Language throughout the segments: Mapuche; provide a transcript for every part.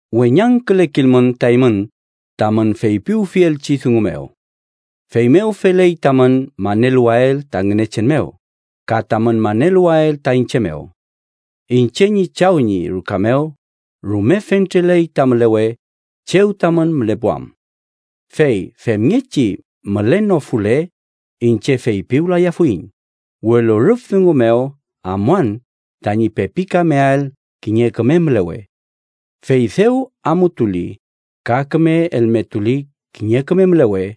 “Weñangkülekilmün ta eymün tamün feypiwfielchi dungu mew. Feymew feley tamün maneluwael ta Ngünechen mew ka tamün maneluwael ta iñche mew. Iñche ñi Chaw ñi ruka mew rume fentreley ta mülewe chew tamün mülepuam. Fey femngechi mülenofule, iñche feypiwlayafuiñ, welu rüf dungu mew amuan tañi pepikameael kiñe küme mülewe. Fey dew amutuli ka küme elmetuli kiñe küme mülewe,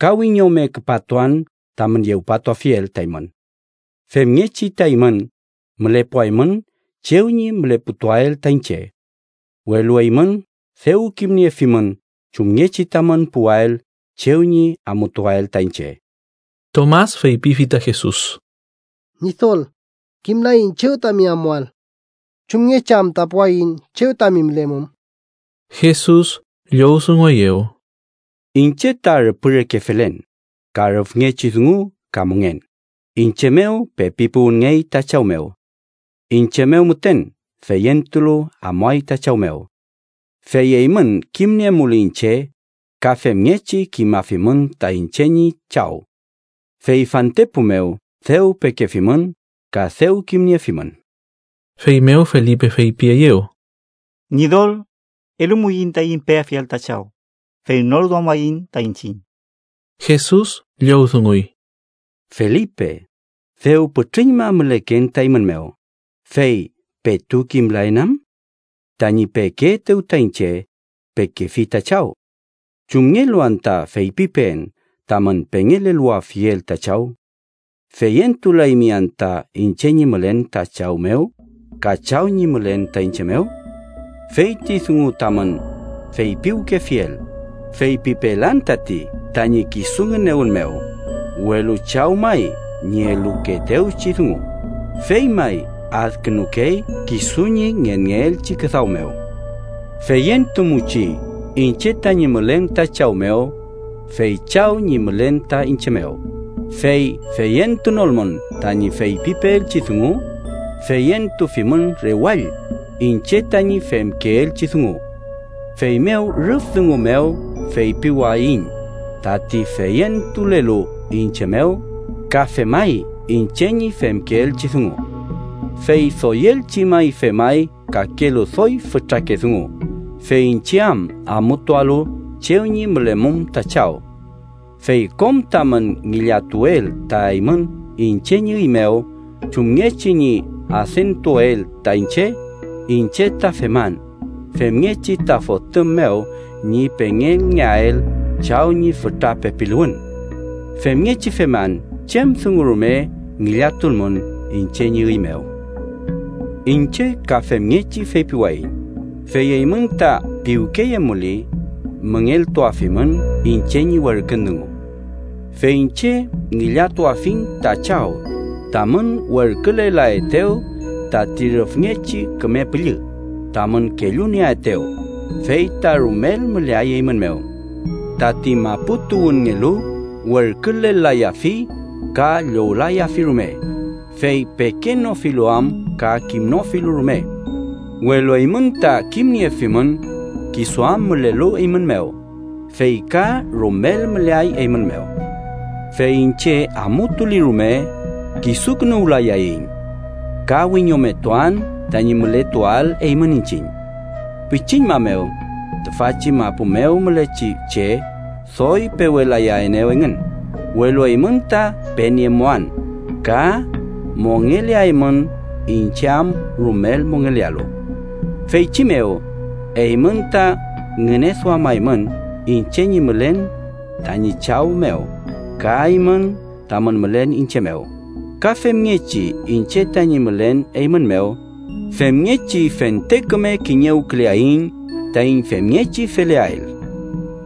ka wiñome küpatuan tamün yewpatuafiel ta eymün, femngechi ta eymün mülepuaymün chew ñi müleputuael ta iñche. Welu eymün dew kimniefimün chumngechi tamün puwael chew ñi amutuael ta iñche.” Tomas feypifi ta Jesus: —Ñidol, kimlaiñ chew tami amuael. ¿Chumngechi anta puwaiñ chew tami mülemum? Jesus llowdungueyew: —Iñche ta rüpü reke felen, ka rüfngechi dungu ka mongen, iñche mew pepi puwünngey ta Chaw mew. Iñche mew müten feyentulu amuay ta Chaw mew. Fey eymün kimniemuli iñche, ka femngechi kimafimün ta iñche ñi Chaw. Fey fantepu mew dew pekefimün ka dew kimniefimün. Feymew Felipe feypieyew: —Ñidol, elumuiñ taiñ peafiel ta Chaw, fey nor duamaiñ ta iñchiñ. Jesus llowdunguy: —Felipe, dew pütrüñma müleken ta eymün mew, ¿fey petu kimlaen am? Tañi pekeetew ta iñche, pekefi ta Chaw. ¿Chumngelu anta feypipeen tamün pengeleluwafiel ta Chaw? ¿Feyentulaymi anta iñche ñi mülen ta Chaw mew ka Chaw ñi mülen ta iñche mew? Feyti dungu tamün feypiwkefiel, feypipelan tati tañi kisu ngünewün mew, welu Chaw may ñi elukeetewchi dungu, fey may adkünukey kisu ñi ngenngeelchi küdaw mew. Feyentumuchi iñche tañi mülen ta Chaw mew, fey Chaw ñi mülen ta iñche mew: fey feyentunolmün tañi feypipeelchi dungu, feyentufimün rewall iñche tañi femkeelchi dungu. Feymew rüf dungu mew feypiwayiñ tati feyentulelu iñche mew, ka femay iñche ñi femkeelchi dungu. Fey doyelchi may femay kakelu doy fütrake dungu, fey iñche am amutualu chew ñi mülemum ta Chaw. Fey kom tamün ngillatuel ta eymün iñche ñi üy mew chumngechi ñi adentuael ta iñche, iñche ta feman, femngechi ta Fotüm mew ñi pengelngeael Chaw ñi fütra pepiluwün. Femngechi feman chem dungu rume ngillatulmün iñche ñi üy mew. “Iñche ka femngechi feypiwayiñ, fey eymün ta piwkeyemuli, müngeltuafimün iñche ñi werkün dungu. Fey iñche ngillatuafiñ ta Chaw tamün werkülelaetew tati Rüfngechi Küme Püllü tamün kellunieaetew, fey ta rumel müleay eymün mew. Tati mapu tuwünngelu werkülelayafi ka llowlayafi rume, fey pekenofilu am ka kimnofilu rume. Welu eymün ta kimniefimün, kisu am mülelu eymün mew fey ka rumel müleay eymün mew. “Fey iñche amutuli rume, kisukünuwlayayiñ. Ka wiñometuan tañi mületuael eymün iñchiñ. Pichiñma mew, tüfachi mapu mew mülechi che doy pewelayaenew engün, welu eymün ta peniemuan, ka mongeleaymün, iñche am rumel mongelealu. Feychi mew, eymün ta ngüneduamaymün iñche ñi mülen tañi Chaw mew, ka eymün tamün mülen iñche mew, ka femngechi iñche tañi mülen eymün mew, femngechi fente küme kiñewküleaiñ taiñ femngechi feleael.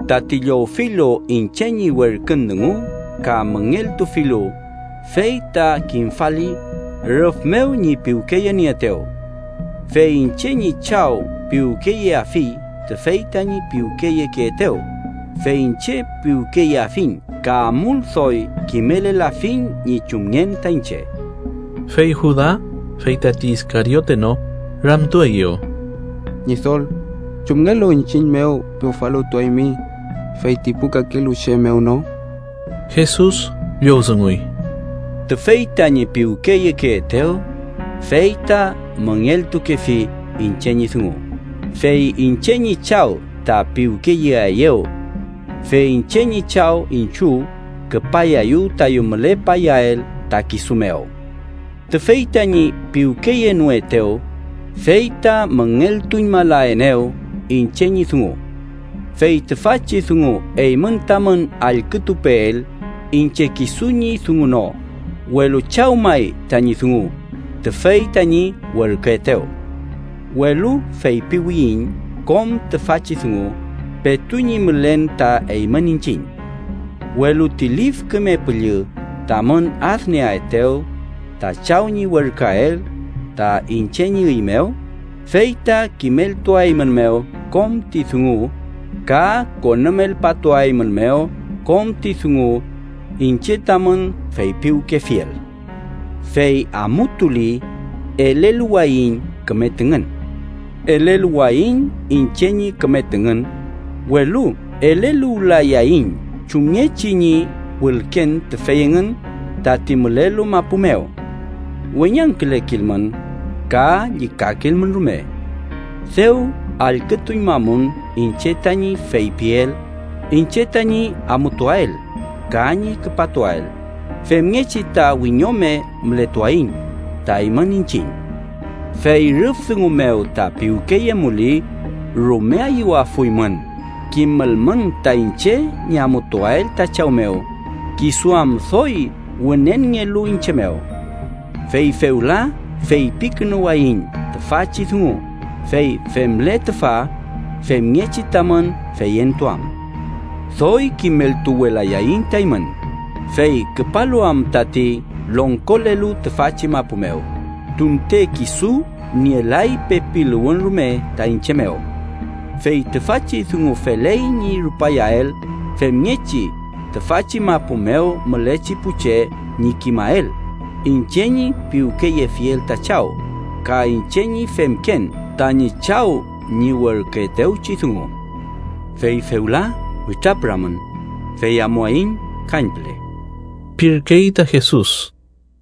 Tati llowfilu iñche ñi werkün dungu ka müngeltufilu, fey ta kimfali rüf mew ñi piwkeyenieetew. Fey iñche ñi Chaw piwkeyeafi tüfey tañi piwkeyekeetew, fey iñche piwkeyeafiñ ka amul doy kimelelafiñ ñi chumngen ta iñche.” Fey Juda (fey tati Iskariote no) ramtueyew: —Ñidol ¿chumngelu iñchiñ mew pewfaluwtuaymi, fey ti pu kakelu che mew no? Jesus llowdunguy: —Tüfey tañi piwkeyekeetew, fey ta müngeltukefi iñche ñi dungu, fey iñche ñi Chaw ta piwkeyeaeyew. Fey iñche ñi Chaw iñchiw küpayayu tayu mülepayael ta kisu mew. Tüfey tañi piwkeyenoetew, fey ta müngeltuñmalaenew iñche ñi dungu. Fey tüfachi dungu eymün tamün allkütupeel iñche kisu ñi dungu no, welu Chaw may tañi dungu, tüfey tañi werküetew. “Welu feypiwiyiñ kom tüfachi dungu petu ñi mülen ta eymün iñchiñ. Welu ti Lif Küme Püllü, tamün adnieaetew, ta Chaw ñi werküael ta iñche ñi üy mew, fey ta kimeltuaeymünmew kom ti dungu ka konümelpatuaeymünmew kom ti dungu iñche tamün feypiwkefiel. “Fey amutuli, eleluwayiñ küme tüngün. Eleluwayiñ iñche ñi küme tüngün, welu eleluwlayayiñ chumngechi ñi wülken tüfey engün tati mülelu mapu mew. Weñangkülekilmün ka llükakilmün rume. Dew allkütuñmamun iñche tañi feypiel iñche tañi amutuael ka ñi küpatuael femngechi ta wiñome mületuaiñ ta eymün iñchiñ. Fey rüf dungu mew ta piwkeyemuli, rume ayüwafuymün kimülmün ta iñche ñi amutuael ta Chaw mew, kisu am doy wünenngelu iñche mew. Fey fewla feypikünuwayiñ tüfachi dungu, fey femle tüfa, femngechi tamün feyentuam. “Doy kimeltuwelayaiñ ta eymün, fey küpalu am tati longkolelu tüfachi mapu mew, tunte kisu nielay pepiluwün rume ta iñche mew. Fey tüfachi dungu feley ñi rupayael femngechi tüfachi mapu mew mülechi pu che ñi kimael iñche ñi piwkeyefiel ta Chaw, ka iñche ñi femken tañi Chaw ñi werküetewchi dungu. “Fey fewla witrapüramün, fey amuaiñ kañpüle” pirkey ta Jesus.